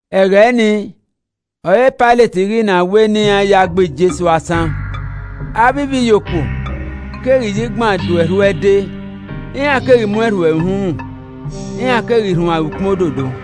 Ẹghẹ nii ọre Pailet ghi na wẹ ne iran ya gbe Jesu asan. Avbe ivbiyokuo keghi ya igban do erhu ẹde, iran keghi mu ẹn rhuẹ ẹre uhunmwu, iran keghi rhuan ẹre ukpọn ododo.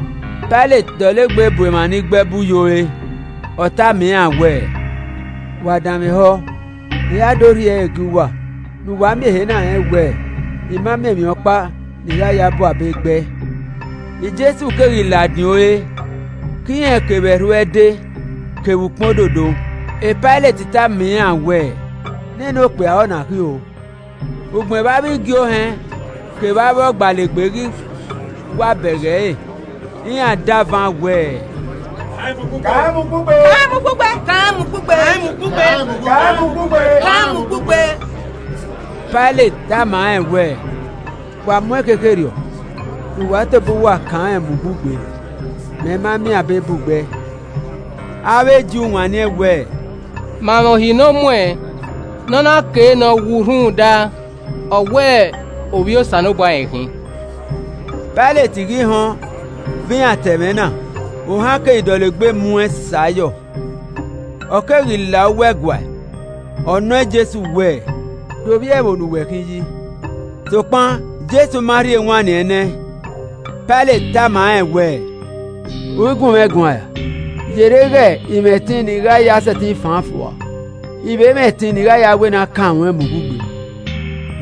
Pailet dọlegbe bu emwa ni gbe ẹbu ye ore, ọ tama iran wẹẹ, “Wa danmwehọ, I ra do rhie ẹre gie uwa, ne uwa miẹn ehe na rẹn wẹẹ, ‘I ma miẹn emwi ọkpa ne I gha ya bu abe gbe ẹe.’” Jesu keghi ladian ore ke irẹn kevbe erhu ẹde kevbe ukpọn ododo. Pailet tama iran wẹẹ, “Nene okpia ọ na khin o.” Ugbẹn vbe avbe igie ohẹn kevbe avbe ọgbalegbe ghi wa bẹghe ẹre, iran davan wẹẹ, “Kan rẹn mu ugbugbe! Kan rẹn mu ugbugbe!” Pailet tama iran wẹẹ, “Wa mu ẹn khekherriọ ne uwa tobọ uwa ya kan rẹn mu ugbugbe, Mẹ ma miẹn abe bu gbe ẹe.” Avbe Ju wanniẹn wẹẹ, “Ma mwẹ uhi ne ọ muẹn ne ọ na kei ne ọ wu rhunmwuda, ọ wẹ Ovbi Osanobua rẹn khin.” Pailet ghi họn vbe iran ta ẹmwẹ na, ohan keghi dọlegbe mu ẹn sẹ ayọ. Ọ keghi la uwu ẹguae, ọ nọ Jesu wẹ, “De ovbi ẹvbo ne uwẹ khin yi?” Sokpan Jesu ma rhie ewanniẹn ne ẹn. Pailet tama rẹn wẹẹ, “U i gun mwẹ guan ra? Yerre ighẹ I mwẹ ẹtin ne i gha ya sẹtin fan an fua, I vbe mwẹ ẹtin ne I gha ya wẹ ne a kan ruẹn mu ugbugbe.”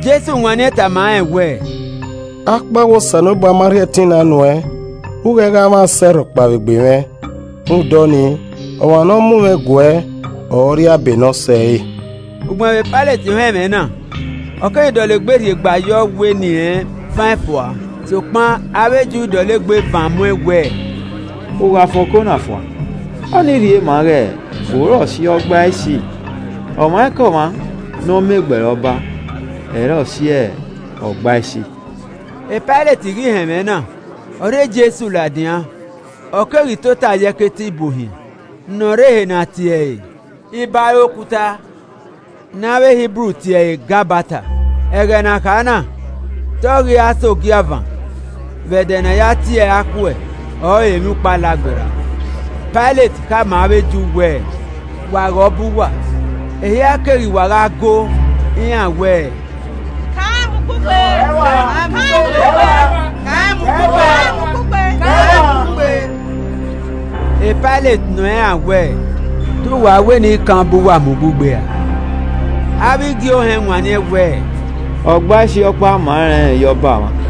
Jesu wanniẹn tama rẹn wẹ, “Akpawẹ Osanobua ma rhie ẹtin na nu ẹn, u i ghẹ gha mwẹ asẹ rhọkpa vbe egbe mwẹ. Rhunmwuda ọnii, ọmwa ne ọ mu mwẹ guẹ ọre ọ rri abe ne ọ sẹre.” Ugbẹn vbe Pailet họn ẹmwẹ na, ọ keghi dọlegbe rhiegba yọ wẹ ne irẹn fan ẹn fua. Sokpan avbe Ju dọlegbe van mu ẹn wẹẹ, “U gha fan oko na fua, ọnii rhie maa ighe u i re ọse Ọgbaisi. Ọmwaikọmwa ne ọ ma egbe ẹre ọba, ẹ i re ọse Ọgbaisi!” Pailet ghi họn ẹmwẹ na, ọ rhie Jesu ladian, ọ keghi tota ye, ẹkete ibuohiẹn ne ọ rre ehe ne a tie ẹre “Ibare Okuta,” (ne avbe Hibru tie ẹre Gabata.) Ẹghẹ ne a kha na, te ọ ghi ra sẹ ogiavan vbe ẹdẹ ne a ya tie ẹre akhuẹ ọre Emwiukpo Alagberra, Pailet khama avbe Ju wẹẹ, “Wa ghe Ọba uwa!” Ehia keghi wa gha go, iran wẹ, “Gbe ẹe rua! Gbe ẹe rua! Kan rẹn mu ugbugbe!” Pailet nọ iran wẹẹ, “Te uwa wẹ ne I kan ọba uwa mu ugbugbe ra?” Avbe igie ohẹn wanniẹn wẹẹ, “Ọgbaisi ọkpa ma rẹn ye ọba mwa!”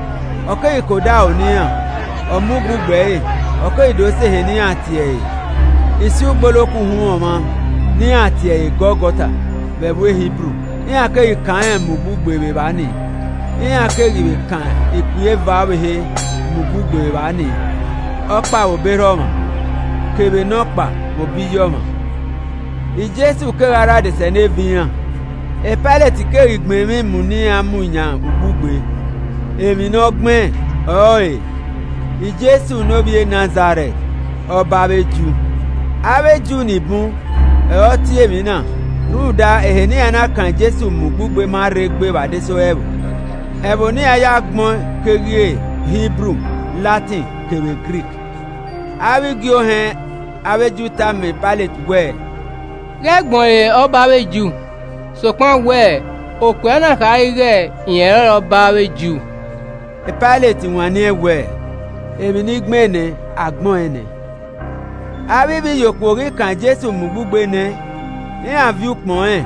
Ọ keghi ke odaro ne iran, ọ mu ugbugbe ẹre, ọ keghi do sẹ ehe ne iran tie ẹre “Isi Ugboloko Uhunmwu Ọmwa,” (ne iran tie ẹre “Gọlgọta” vbe ẹvbo Hibru.) Iran keghi kan rẹn mu ugbugbe vbe evba nii, iran keghi vbe kan ikpia eva ọvbehe mu ugbugbe vbe evba nii, ọkpa vbe obọ erha ọmwa, kevbe nọkpa vbe obọ iye ọmwa: Jesu kegha rre adesẹneva iran. Pailet keghi gbẹn emwi mu ne iran mu yan ugbugbe, Emwi ne ọ gbẹn ọrọre: “Jesu ne ovbi e Nazarẹt ọba avbe Ju.” Avbe Ju ni bun ọre ọ tie emwi na, rhunmwuda ehe ne iran na kan Jesu mu ugbugbe ma rre gbe vbe adesẹ ore ẹvbo. Ẹvbo ne iran ya gbẹn ọẹn keghi re Hibru, Latin kevbe Grik. Avbe igie ohẹn avbe Ju tama Pailet wẹẹ, “Ghẹ gbẹn ọẹn re ‘Ọba avbe Ju’ sokpan wẹ, ‘Okpia na khare ighẹ rẹn ọrọre ọba avbe Ju!’” Pailet wanniẹn wẹẹ, “Emwi ne I gbẹn nẹ, a gbẹn ọẹn nẹ.” Avbe ivbiyokuo ghi kan Jesu mu ugbugbe nẹ, iran viọ ukpọn rẹn,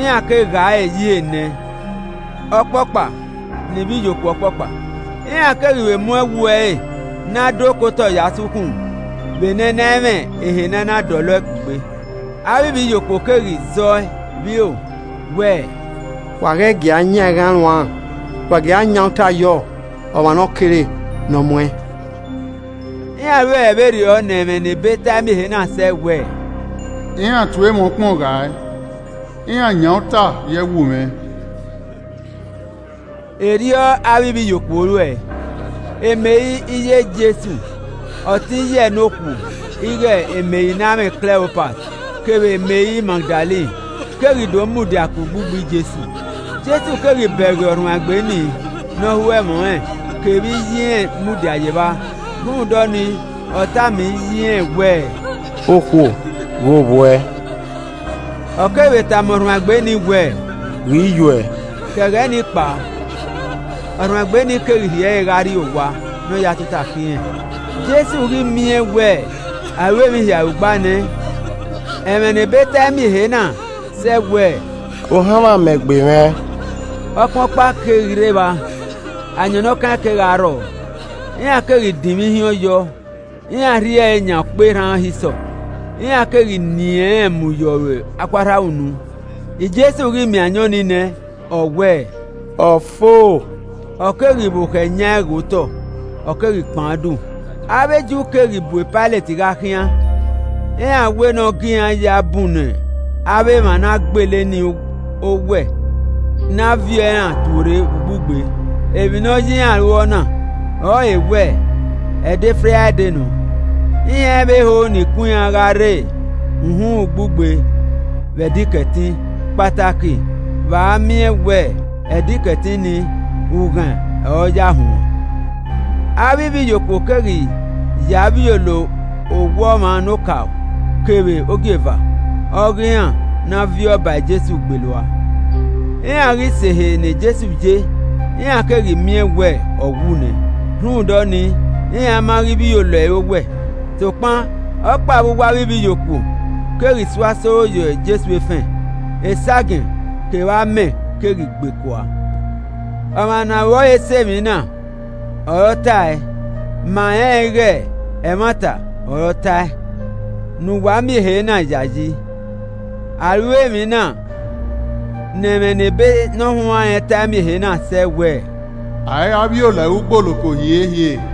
iran ke ghae ẹre ye ihe enẹ ọkpọkpa ne ivbiyokuo ọkpọkpa. Iran keghi vbe mu ẹwu ẹre ne a do ke otọ ya sẹ ukhunmwu vbe ne ẹ i na mwẹ ehe ne a na dọlọ ẹe kugbe. Avbe ivbiyokuo keghi zẹ ọe vbe iro wẹẹ, “Wa ghẹ gia yanghaẹn ruan, wa gie a yan uta yọ ọmwa ne ọ kere ne ọ mu ẹn.” Iran ruẹe vberriọ ne ẹmwẹ ne ebe tae miẹn ehe na sẹ wẹẹ, “Iran tue mwẹ ukpọn ghae. Iran yan uta ye ẹwu mwẹ.” Erriọ avbe ivbiyokuo ruẹe. Meri iye Jesu, ọtẹn iye ẹe ne okhuo ighe Meri ne amwẹ Kleopas kevbe Meri Magdalen, keghi do mudia ke ugbugbe Jesu. Jesu keghi bẹghe ọrhuanegbe ni ne ọ ho ẹmwẹ ọnrẹn, kevbe iye irẹn mudia ye evba. Rhunmwuda ọnii, ọ tama iye irẹn wẹẹ, “Okhuo, ghe ovbi uẹ.” Ọ keghi vbe tama ọrhuanegbe nii wẹẹ, “Ghe iye uẹ” ke ẹghẹ ni kpao, ọrhuanegbe nii keghi rhie ẹre gha rrie owa ne ọ ya tota ke irẹn. Jesu ghi miẹn wẹ a ru emwi hia orugba nẹ, ne ẹmwẹ ne ebe tae miẹn ehe na sẹ, ọ wẹẹ, “Ohanmwẹ amẹ gbe mwẹ!” Ọkpan ọkpa keghi rre evba, ayọn ne ọ kaẹn kegha rrọọ, iran keghi dinmwi ihiọn yọ, iran rhie ẹre yan ọkpọ erhan hisọp, iran keghi nien rẹn mu ye ọre akhuarhamwunu. Jesu ghi miẹn ayọn ni nẹ, ọ wẹẹ, “Ọ fo.” Ọ keghi vbokhọ ẹyaẹn ghe otọ ọ keghi kpan udu. Avbe Ju keghi bu Pailet gha khian, iran wẹ ne ọ gie iran ya bunnọ avbe emwa ne a gbele ni owẹ ne a viọ iran tuorre vbe ugbugbe. Emwi ne ọ ya iran ru ọna ọrọre wẹ ẹdẹ Fraide nọ, iran i vbe ho ne ikun iran gha rre uhunmwu ugbugbe vbe Ẹdẹ Ikẹtin, kpataki vbe a miẹn wẹ Ẹdẹ Ikẹtin nii, ughaẹn ọ ya huan. Avbe ivbiyokuo keghi ya vbiolo owẹ ọmwa nokaro, kevbe ogieva ọghe iran ne a viọ ba Jesu gbele ua. Iran ghi sẹ ehe ne Jesu ye, iran keghi miẹn wẹ ọ wu nẹ, rhunmwuda ọnii, iran ma ghi vbiolo ẹre. owẹ. Sokpan, ọkpa vbe uwu avbe ivbiyokuo keghi so asoro ẹre ye Jesu efẹn, esagiẹn kevbe amẹ keghi gbe kua. ( Ọmwa ne aro ẹre sẹ emwi na ọre ọ ta ẹe. Ma rẹnrẹn ighe ẹmwata ọre ọ ta ẹe, ne uwa miẹn ehe na yayi.) A ru emwi na ne ẹmwẹ ne ebe ne ọ huanrẹn ta ẹe miẹn ehe na sẹ wẹ, “A i ra vbiolo ẹre ugboloko hiehie.”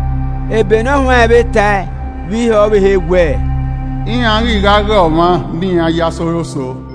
Ebe ne ọ huanrẹn vbe ta ẹe vbe ihe ọvbehe wẹ, “Iran ghi gha ghe ọmwa ne iran ye asoro so.”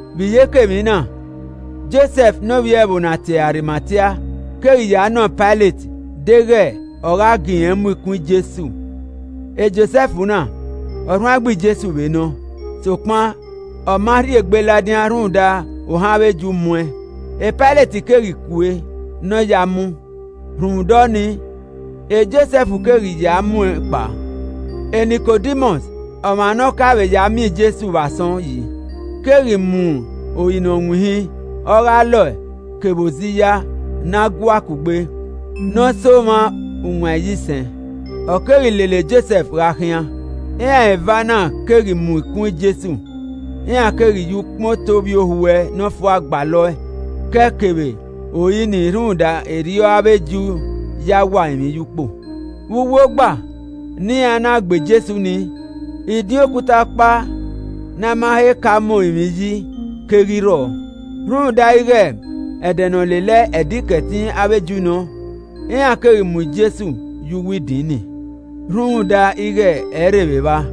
Vbe iyeke emwi na, Josẹf ne ovbi ẹvbo ne a tie ẹre Arimatia keghi ya nọ Pailet deghẹ ọ gha gie irẹn mu ikun Jesu (Josẹf na, ọrhuanegbe Jesu vbe nọ, sokpan ọ ma rhie egbe ladian rhunmwuda ohan avbe Ju muẹn.) Pailet keghi kue ne ọ ya mu, rhunmwuda ọnii, Josẹf keghi ya muẹn kpao. Nikodimọs, ọmwa ne ọ ka vbe ya miẹn Jesu vbe asọn yi, keghi mu ori ne ọ winhin, ọghe alọe kevbe oziya ne a gua kugbe, ne ọ sẹ omwa uwan iyisẹn, ọ keghi lele Josẹf gha khian. Iran eva na keghi mu ikun Jesu iran keghi ya ukpọn eto ovbiohuẹ nọfua gbalọ ẹe ke ẹe kevbe ori nii rhunmwuda erriọ avbe Ju ya wa orinmwi ye ukpo. Vbe uwu ogba ne iran na gbe Jesu nii, idin okuta ọkpa ne a ma he ka mu orinmwi yi keghi rrọọ. Rhunmwuda ighe ẹdẹ ne ọ lele Ẹdẹ Ikẹtin avbe Ju nọ, iran keghi mu Jesu ye uwu idin nii, rhunmwuda ighe ẹ i rre vbe evba.